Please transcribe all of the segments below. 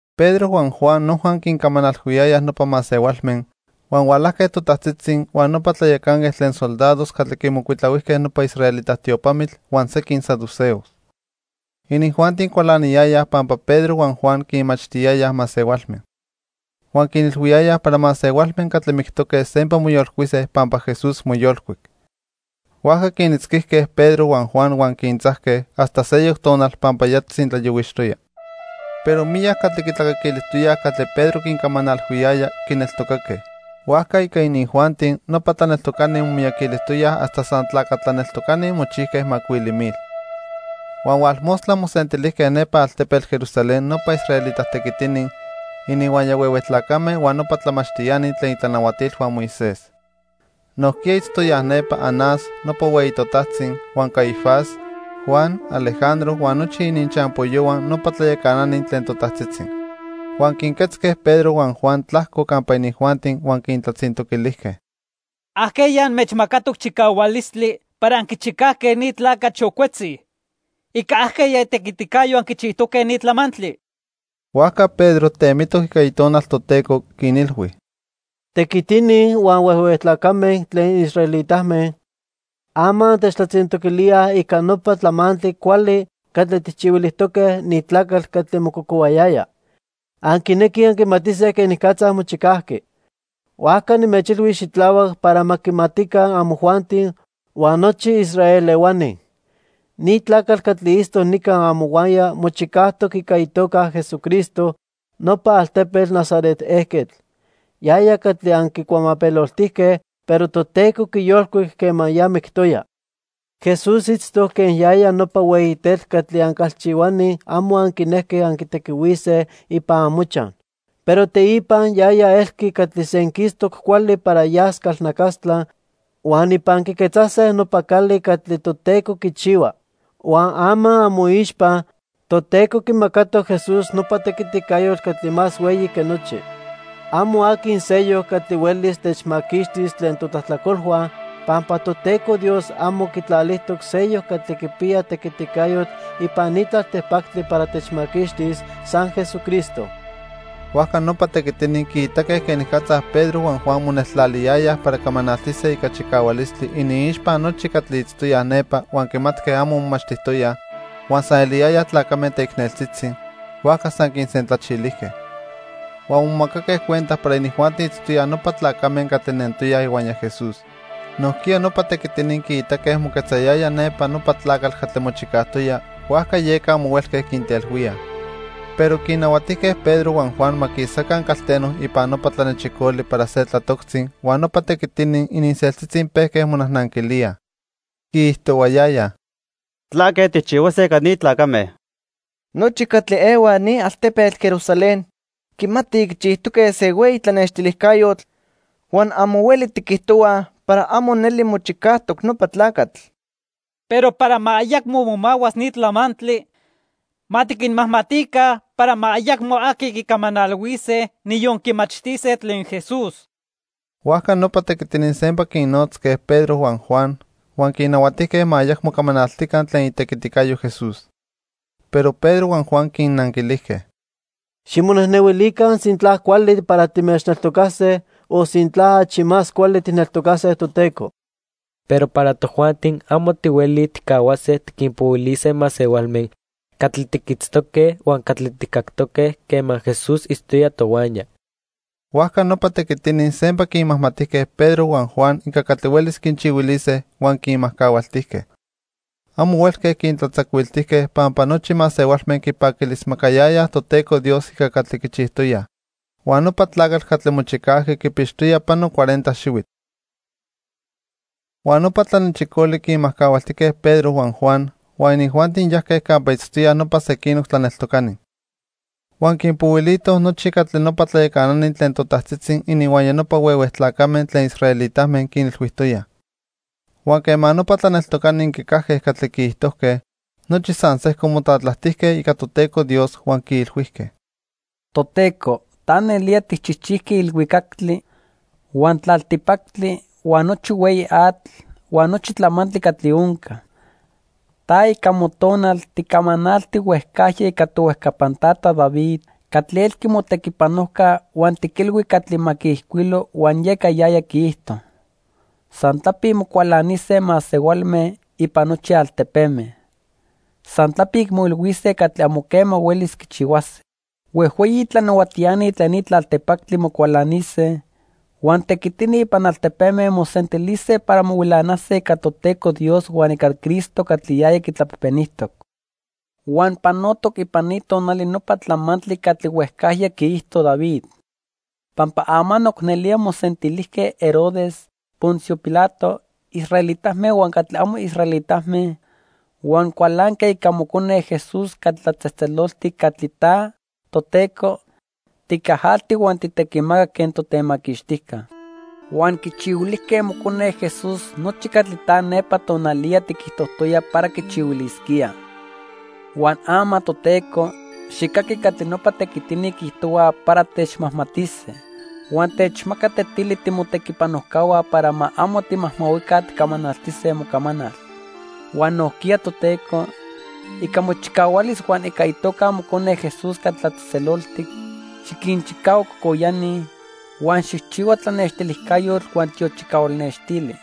Pedro huan Juan noja quincamanalhuiyayaj nopa masehualme, huan hualajque totajtzitzi, huan nopa tlayacanquetl tlen soldados catli quimocuitlahuijque nopa israelita tiopamitl huan sequin saduceos. Inijuanti cualaniyayaj pampa Pedro huan Juan quinmachtiyayaj masehualme. Huan quinilhuiyayaj para masehualme catli mictoque sempa moyolcuise pampa Jesús moyolcuic. Huajca quinitzquijque Pedro huan Juan huan quintzajque hasta seyoc tonal pampa ya tzintlayohuixtoya. Pero miyac catli quitlacaquilijtoyaj catli Pedro quincamanalhuiyaya, quineltocaque. Huajca ica inijuanti, nopa tlaneltocani momiyaquilijtoyaj hasta san tlaca tlaneltocani mochijque macuili mil. Huan hualmostla mosentilijque nepa altepetl Jerusalén nopa israelita tequitini, ininhuaya huehue tlacame huan nopa tlamachtiani tlen itlanahuatilhua Moisés. Nojquiya itztoyaj nepa Anás, nopa hueyi totajtzi, huan Caifás, Juan, Alejandro huan nochi ininchampoyohua nopa tlayacanani tlen totajtzitzi. Huan quinquetzque Pedro huan Juan tlajco campa inijuanti huan quintlatzintoquilijque: —¿Ajqueya anmechmacatoc chicahualistli para anquichicajque ni tlacatl xocuetzi? ¿Ica ajqueya itequiticayo anquichijtoque ni tlamantli? Huajca Pedro temitoc ica Itonal Toteco, quinilhui: —Tequitini huan huehue tlacame tlen israelitame, ama antechtlatzintoquilíaj ica nopa tlamantli cuali catli tijchihuilijtoque ni tlacatl catli mococohuayaya. Anquinequij anquimatise quenicatza mochicajqui. Huajca nimechilhuis xitlahuac para ma quimatica amojuanti huan nochi Israel ehuani. Ni tlacatl catli itztoc nica amohuaya mochicajtoc ica itoca Jesucristo, nopa altepetl Nazaret ejquetl. Yaya catli anquicuamapeloltijque, pero Toteco quiyolcuic quema ya mictoya. Jesús itztoc quen yaya nopa hueyi tetl catli ancalchihuani amo anquinejque anquitequihuise ipan amochaj. Pero teipa yaya elqui catli senquistoc cuali para yas calnacastla huan ipan quiquetzase nopa cali catli Toteco quichihua. Huan ama amoixpa, Toteco quimacatoc Jesús nopa tequiticayotl catli más hueyi que nochi. Amo aqui seyoc catli huelis techmaquixtis tlen totlajtlacolhua, pampa Toteco Dios amo quitlalijtoc seyoc catli quipiya tequiticayotl ipan ni tlaltipactli para techmaquixtis, san Jesucristo. Huajca nopa tequitini quiitaque quenicatza Pedro huan Juan moneltlaliyayaj para camanaltise ica chicahualistli iniixpa nochi catli itztoyaj nepa huan quimatque amo momachtijtoyaj, huan san eliyaya tlacame teicneltzitzi; huajca san quinsentlachilijque. Huan momacaque cuenta para inijuanti itztoyaj nopa tlacame catli nentoyaj ihuaya Jesús. Nojquiya nopa tequitini quiitaque moquetzayaya nepa nopa tlacatl catli mochicajtoya, huajca yeca amo huelque quintelhuíaj. Pero quinnahuatijque Pedro huan Juan ma quisaca calteno ipan nopa tlanechicoli para se tlatoctzi huan nopa tequitini ininseltzitzi pejque monajnanquilíaj. Quiijtohuayayaj: —¿Tlaque tijchihuase ica ni tlacame? Nochi catli ehuaj ni altepetl Jerusalén quimatij quichijtoque se hueyi tlanextilijcayotl huan amo hueli tiquijtohuaj para amo neli mochicajtoc nopa tlacatl. Pero para ma ayacmo momahuas ni tlamantli, ma tiquinmajmatica para ma ayacmo aqui quicamanalhuise, niyon quimachtise tlen Jesús. Huajca nopa tequitini sempa quinnotzque Pedro huan Juan huan quinnahuatijque ma ayacmo camanaltica tlen itequiticayo Jesús. Pero Pedro huan Juan quinnanquilijque: —Ximonejnehuilica sintla cuali para timechneltocase o sintla achi más cuali tijneltocase Toteco. Pero para tojuanti amo tihuelij tijcahuase tiquinpohuilise masehualme catli tiquitztoque huan catli tijcactoque quema Jesús itztoya tohuaya. Huajca nopa tequitini sempa quinmajmatijque Pedro huan Juan ica catli huelis quinchihuilise huan quinmajcahualtijque. Amo huelque quintlatzacuiltijque, pampa nochi masehualme quipaquilismacayayaj Toteco Dios ica catli quichijtoyaj. Huan nopa tlacatl catli mochicajqui quipixtoya pano cuarenta xihuitl. Huan nopa tlanechicoli quinmajcahualtijque Pedro huan Juan, huan inijuanti yajque campa itztoyaj nopa sequinoc tlaneltocani. Huan quinpohuilitoj nochi catli nopa tlayacanani tlen totajtzitzi ininhuaya nopa huehue tlacame tlen israelitame quinilhuijtoyaj. Huan quema nopa tlaneltocani quicajque catli quiijtojque, nochi san sejco motlatlajtijque ica Toteco Dios huan quiilhuijque: "Toteco, ta nelía tijchijchijqui ilhuicactli, huan tlaltipactli, huan nochi hueyi atl, huan nochi tlamantli catli onca. Ta, ica Motonal, ticamanalti huejcajya ica tohuejcapan tata David catli elqui motequipanojca huan tiquilhui catli ma quiijcuilo huan yeca yaya quiijto: 'San tlapic mocualanise masehualme ipan nochi altepeme. San tlapic moilhuise catli amo quema huelis quichihuase. Huejhueyi tlanahuatiani tlen ni tlaltipactli mocualanise, huan tequitini ipan altepeme mosentilise para mohuilanase ica Toteco Dios huan ica Cristo catli yaya quitlapejpenijtoc.' "Huan panotoc ipan ni tonali nopa tlamantli catli huejcajya quiijto David. Pampa amanoc nelía mosentilijque Herodes, Poncio Pilato, israelitame huan catli amo israelitame huan cualanque ica Mocone Jesús catli tlatzejtzeloltic catli ta, Toteco, ticajalti huan tijtequimacac quen totemaquixtijca. Huan quichihuilijque Mocone Jesús nochi catli ta nepa tonaliya tiquijtojtoya para quichihuilisquíaj. Huan ama, Toteco, xijcaqui catli nopa tequitini quiijtohuaj para techmajmatise, huan techmaca tetili timotequipanojcahua para ma amo timajmahuica ticamanaltise mocamanal. Huan nojquiya, Toteco, ica mochicahualis huan ica itoca Mocone Jesús catli tlatzejtzeloltic, xiquinchicahua cocoyani, huan xijchihua tlanextilijcayotl huan tiochicahual nextili."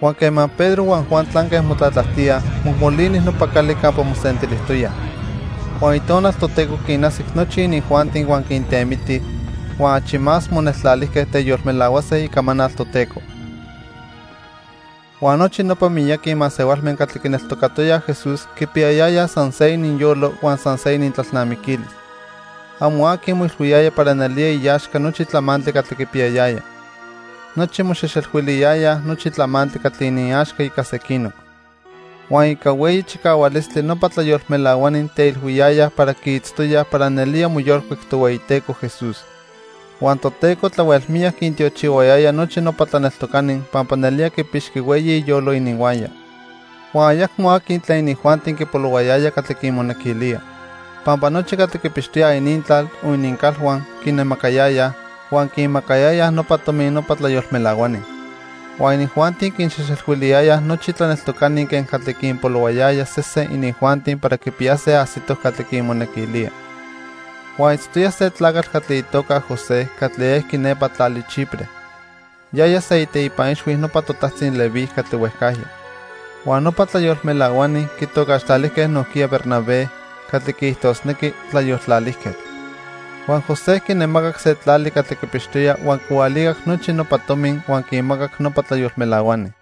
Huan quema Pedro huan Juan tlanque motlatlajtíaj, mojmolini nopa cali campa mosentilijtoyaj. Huan Itonal Toteco quinajsic nochi inijuanti huan quintemiti, huan achi más moneltlalijque teyolmelahuase icamanal Toteco. Huan nochi nopa miyaqui masehualme catli quineltocatoyaj Jesús quipiyayayaj san se ininyolo huan san se inintlalnamiquilis. Amo aqui moilhuiyaya para nelía iaxca nochi tlamantli catli quipiyayaya. Nochi moxejxelhuiliyayaj nochi tlamantli catli iniaxca ica sequinoc. Huan ica hueyi chicahualistli nopa tlayolmelahuani teilhuiyayaj para quiitztoyaj para nelía moyolcuic Tohueyiteco Jesús. Huan Toteco tlahuel miyac quintiochihuayaya nochi nopa tlaneltocani pampa nelía quipixqui hueyi iyolo ininhuaya. Huan ayacmo aqui tlen inijuanti quipolohuayaya catli quimonequilía. Pampa nochi catli quipixtoyaj inintlal o inincalhua quinnemacayayaj, huan quinmacayayaj nopa tomi nopa tlayolmelahuani. Huan inijuanti quinxejxelhuiliyayaj nochi tlaneltocani quen catli quinpolohuayaya sesen inijuanti para quipiyase ajsitoc catli quinmonequilía. Huan itztoya se tlacatl catli itoca José, catli ejqui nepa tlali Chipre. Yaya se iteipa ixhui nopa totajtzi Leví catli huejcajya. Huan nopa tlayolmelahuani quitocaxtlalijque nojquiya Bernabé, catli quiijtosnequi "tlayoltlalijquetl". Huan José quinemacac se tlali catli quipixtoya huan quihualicac nochi nopa tomi huan quinmacac nopa tlayolmelahuani.